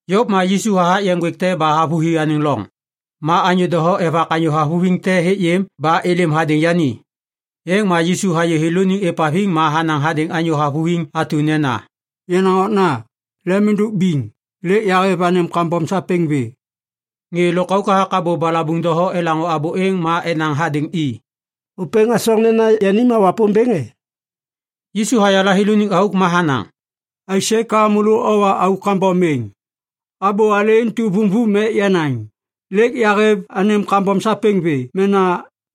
Yôv ma Yisu hathak yeŋ ŋgwêk te ba havôhi anêŋ loŋ. Ma anyô doho evak anyô havuviŋ te hêk yêm ba êlêm hadêŋ yani. Êŋ ma Yisu hayê thêlôniŋ êvhaviŋ ma hanaŋ hadêŋ anyô havuviŋ atu nena, “Yenaŋ okna, lem êndôk biŋ. Lêk yahêv anêm kambom sapêŋ vê.” Ŋê lôkauk hathak abô balabuŋ doho elaŋô abô êŋ ma enaŋ hadêŋ i, “Ôpêŋ hasoŋ nena yani ma Wapômbêŋ e?” Yisu hayala thêlôniŋ auk ma hanaŋ, “Aisê ka môlô owa auk kambom êŋ? Abô alê intu vumvum ek yanaŋ: ‘Lêk yahêv anêm kambom sapêŋ vê’ mena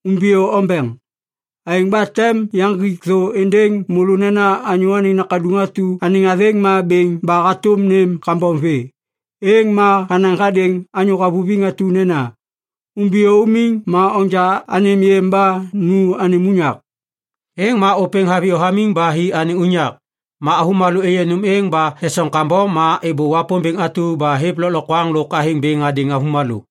‘Umbiyô ombeŋ.’ Aêŋ ba tem yaŋgik thô êndêŋ môlô nena Anyô Anêŋ Nakaduŋ atu anêŋ athêŋ ma bêŋ ba hatôm nêm kambom vê.” Êŋ ma hanaŋ hadêŋ anyô havuviŋ atu nena, “Umbiyô umiŋ ma onja anêm yêm ba nu anêm unyak.” Êŋ ma ôpêŋ haviyô hamiŋ ba hi anêŋ unyak. Ma avômalô êyê nôm êŋ ba esoŋ kambom ma êbô Wapômbêŋ atu ba hêv lôklokwaŋ lôk athêŋ bêŋ hadêŋ avômalô.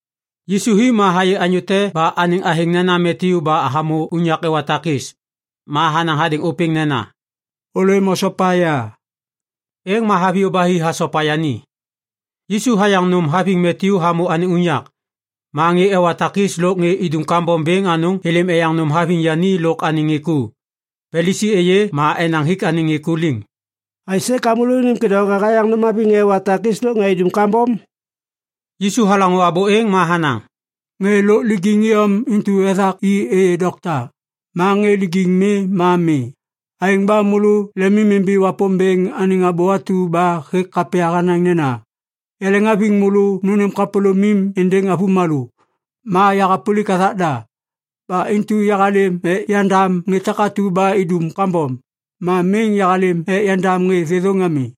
Yisu hi ma hayê anyô te ba anêŋ athêŋ nena Matyu ba hamô unyak ewa takis. Ma hanaŋ hadêŋ ôpêŋ nena, “Ôlêm osopa ya,” êŋ ma haviyô ba hi hasopa yani. Yisu hayaŋ nôm haviŋ Matyu hamô anêŋ unyak. Ma ŋê ewa takis lôk ŋê idum kambom bêŋ anôŋ êlêm eyaŋ nôm haviŋ yani lôk anêŋ ŋê ku. Palisi êyê ma enaŋ hik anêŋ ŋê ku liŋ, “Aisê ka môlônim kêdôŋwaga hayaŋ nôm haviŋ ŋê ewa takis lôk ŋê idum kambom?” Yisu halaŋô abô êŋ ma hanaŋ, “Ŋê lôk lijiŋ iyom intu ethak i êyê dokta. Ma ŋê lijiŋ mi ma mi. Aêŋ ba môlô lemimimbi Wapômbêŋ anêŋ abô atu ba hêk kapya hanaŋ nena, “‘Yaleŋhaviŋ môlô nônêm kapôlômim êndêŋ avômalô. Ma yahapôlik hathak da.’ Ba intu yahalêm ek yandam ŋê takatu ba idum kambom. Ma miŋ yahalêm ek yandam ŋê thêthôŋ ami.”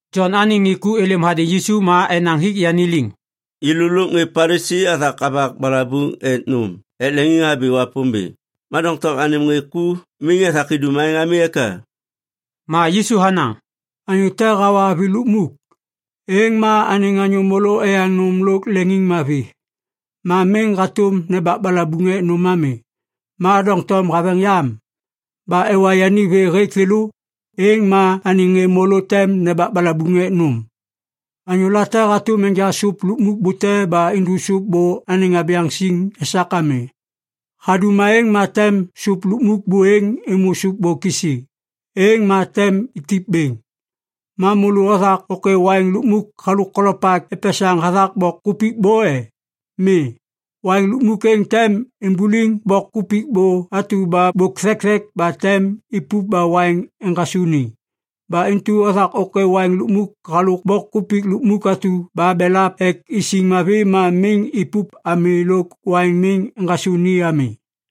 Jon anêŋ ŋê ku êlêm hadêŋ Yisu ma enaŋ hik yani liŋ, “Yêlô lôk ŋê Palisi athak avak balabuŋ ek nôm ek leŋiŋhabi Wapômbêŋ. Ma doŋtom anêm ŋê ku miŋ ethak idum aêŋ ami eka?” Ma Yisu hanaŋ, “Anyô te hawa avi lukmuk, êŋ ma anêŋ anyô môlô eyaŋ nôm lôk leŋiŋmavi. Ma miŋ hatôm nembak balabuŋ ek nôm ami. Ma doŋtom haveŋ yam, ba ewa yani vê hêk thêlô, êŋ ma anêŋ ŋê môlô tem nembak balabuŋ ek nôm.” “Anyô late hatôm enja sôp lukmuk bute ba indu sôp bô anêŋ abyaŋ siŋ esak ami. Hadum aêŋ ma tem sôp lukmuk buêŋ êmô sôp bô kisi. Êŋ ma tem itip bêŋ. Ma môlô othak ôkê waiŋ lukmuk halôk kolopak epesaŋ hathak bok kupik bô e? Mi! Waiŋ lukmuk êŋ tem imbuliŋ bok kupik bô atu bôk thekthek ba tem ipup ba waiŋ eŋgasô ni. Ba intu othak ôkê waiŋ lukmuk halôk bok kupik lukmuk atu ba belap ek isiŋ mavi ma miŋ ipup ami lôk waiŋ miŋ eŋgasô ni ami.”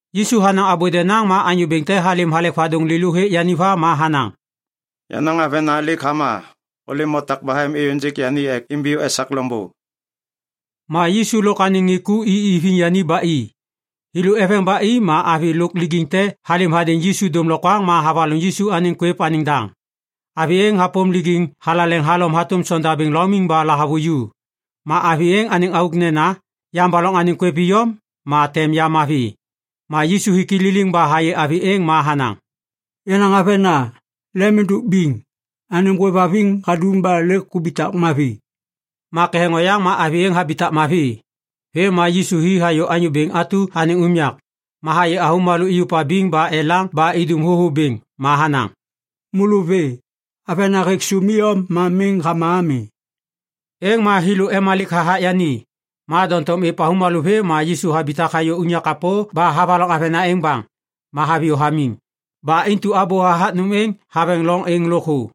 Yisu hanaŋ abô denaŋ ma anyô bêŋ te halêm halek vadôŋ lêlô hêk yani va ma hanaŋ, “Yenaŋ avena lêk hama. Ôlêm otak bahem êyôŋgêk yani ek imbiyô esak loŋbô.” Ma Yisu lôk anêŋ ŋê ku i iviŋ yani ba i. Thêlô eveŋ ba i ma avi lôk lijiŋ te halêm hadêŋ Yisu dômlokwaŋ ma havaloŋ Yisu anêŋ kwêv anêŋ daŋ. Avi êŋ hapôm lijiŋ thalaleŋ halom hatôm sondabêŋ laumiŋ ba lahavuju. Ma avi êŋ anêŋ auk nena, “Yambaloŋ anêŋ kwêv iyom, ma tem ya mavi.” Ma Yisu hik i liliŋ ba hayê avi êŋ ma hanaŋ, “Yenaŋ avena, lem êndôk biŋ. Anêm hôêvhaviŋ hadum ba lêk hubitak mavi.” Ma ketheŋ oyaŋ ma avi êŋ habitak mavi. Vêm ma Yisu hi hayô anyô bêŋ atu anêŋ unyak. Ma hayê avômalô iyuv abiŋ ba elaŋ ba idum thôthô bêŋ ma hanaŋ, “Môlô vê! Avena hêk sôm iyom ma miŋ hama ami.” Êŋ ma thêlô emalik hathak yani. Ma doŋtom êv avômalô vê ma Yisu habitak hayô unyak kapô ba havaloŋ avena êŋ baŋ, ma haviyô hamiŋ. Ba intu abô hathak nôm êŋ haveŋ loŋ êŋ lôkthô.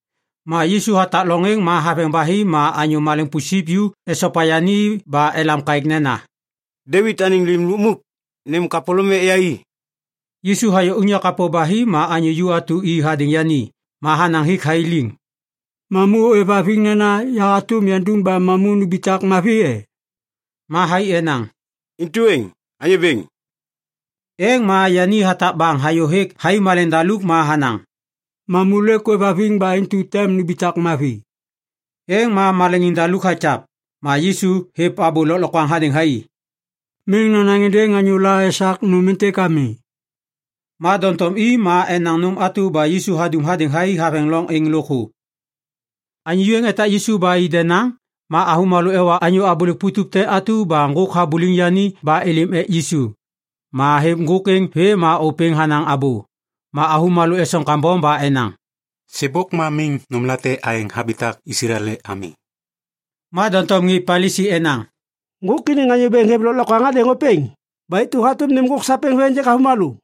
Ma Yisu hatak loŋ êŋ ma haveŋ ba hi, ma anyô maleŋ pusip ju esopa yani ba elam kaêk nena, “Devit anêŋ Lim Lukmuk, nêm kapôlôm ek yai!” Yisu hayô unyak kapô ba hi ma anyô ju atu i hadêŋ yani. Ma hanaŋ hik thai liŋ, “Mamu ôêvhaviŋ nena ya hatôm yandum ba mamu numbitak mavi e?” Ma thai enaŋ, “Intu êŋ. Anyô Bêŋ.” Êŋ ma yani hatak baŋ hayô hêk thai maleŋdaluk ma hanaŋ, “Mamu lêk ôêvhaviŋ ba intu tem numbitak mavi.” Êŋ ma maleŋiŋ daluk hakyav. Ma Yisu hêv abô lôklokwaŋ hadêŋ thai, “Miŋ nonaŋ êndêŋ anyôla esak nôm êntêk ami.” Ma doŋtom i ma enaŋ nôm atu ba Yisu hadum hadêŋ thai haveŋ loŋ êŋ lôkthô. Anyô ju êŋ etak Yisu ba i denaŋ, ma avômalô ewa anyô abôlêk putup te atu ba ŋgôk habuliŋ yani ba êlêm ek Yisu. Ma hêv ŋgôk êŋ vê ma ôpêŋ hanaŋ abô. Ma avômalô esoŋ kambom ba enaŋ, “Sêbôk ma miŋ nômlate aêŋ habitak Islael ami.” Ma doŋtom ŋê Palisi enaŋ, “Ŋgôk iniŋ anyô bêŋ hêv lôklokwaŋ hadêŋ ôpêŋ. Ba intu hatôm nêm ŋgôk sapêŋ vê ênjêk avômalô.”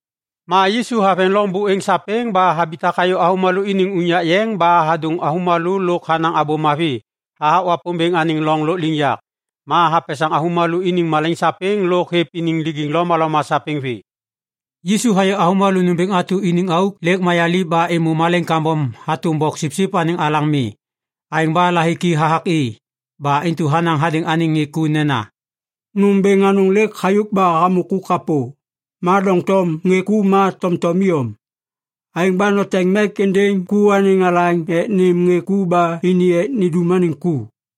Ma Yisu haveŋ loŋ buêŋ sapêŋ ba habitak hayô avômalô iniŋ unyak yeŋ ba hadôŋ avômalô lôk hanaŋ Abô Mavi hathak Wapômbêŋ anêŋ loŋ lôkliŋyak. Ma hapesaŋ avômalô iniŋ malaiŋ sapêŋ lôk hêv iniŋ lijiŋ lomaloma sapêŋ vê. Yisu hayê avômalô nômbêŋ atu iniŋ auk lêk mayaliv ba êmô malaiŋ kambom hatôm boksipsip anêŋ alaŋ mi. Aêŋ ba lahiki hathak i. Ba intu hanaŋ hadêŋ anêŋ ŋê ku nena, “Nôm bêŋ anôŋ lêk hayôk ba hamô ku kapô, ma doŋtom ŋê ku ma tomtom iyom. Aêŋ ba noteŋ mek êndêŋ ku anêŋ alaŋ ek nêm ŋê ku ba ini ek nindum anêŋ ku.”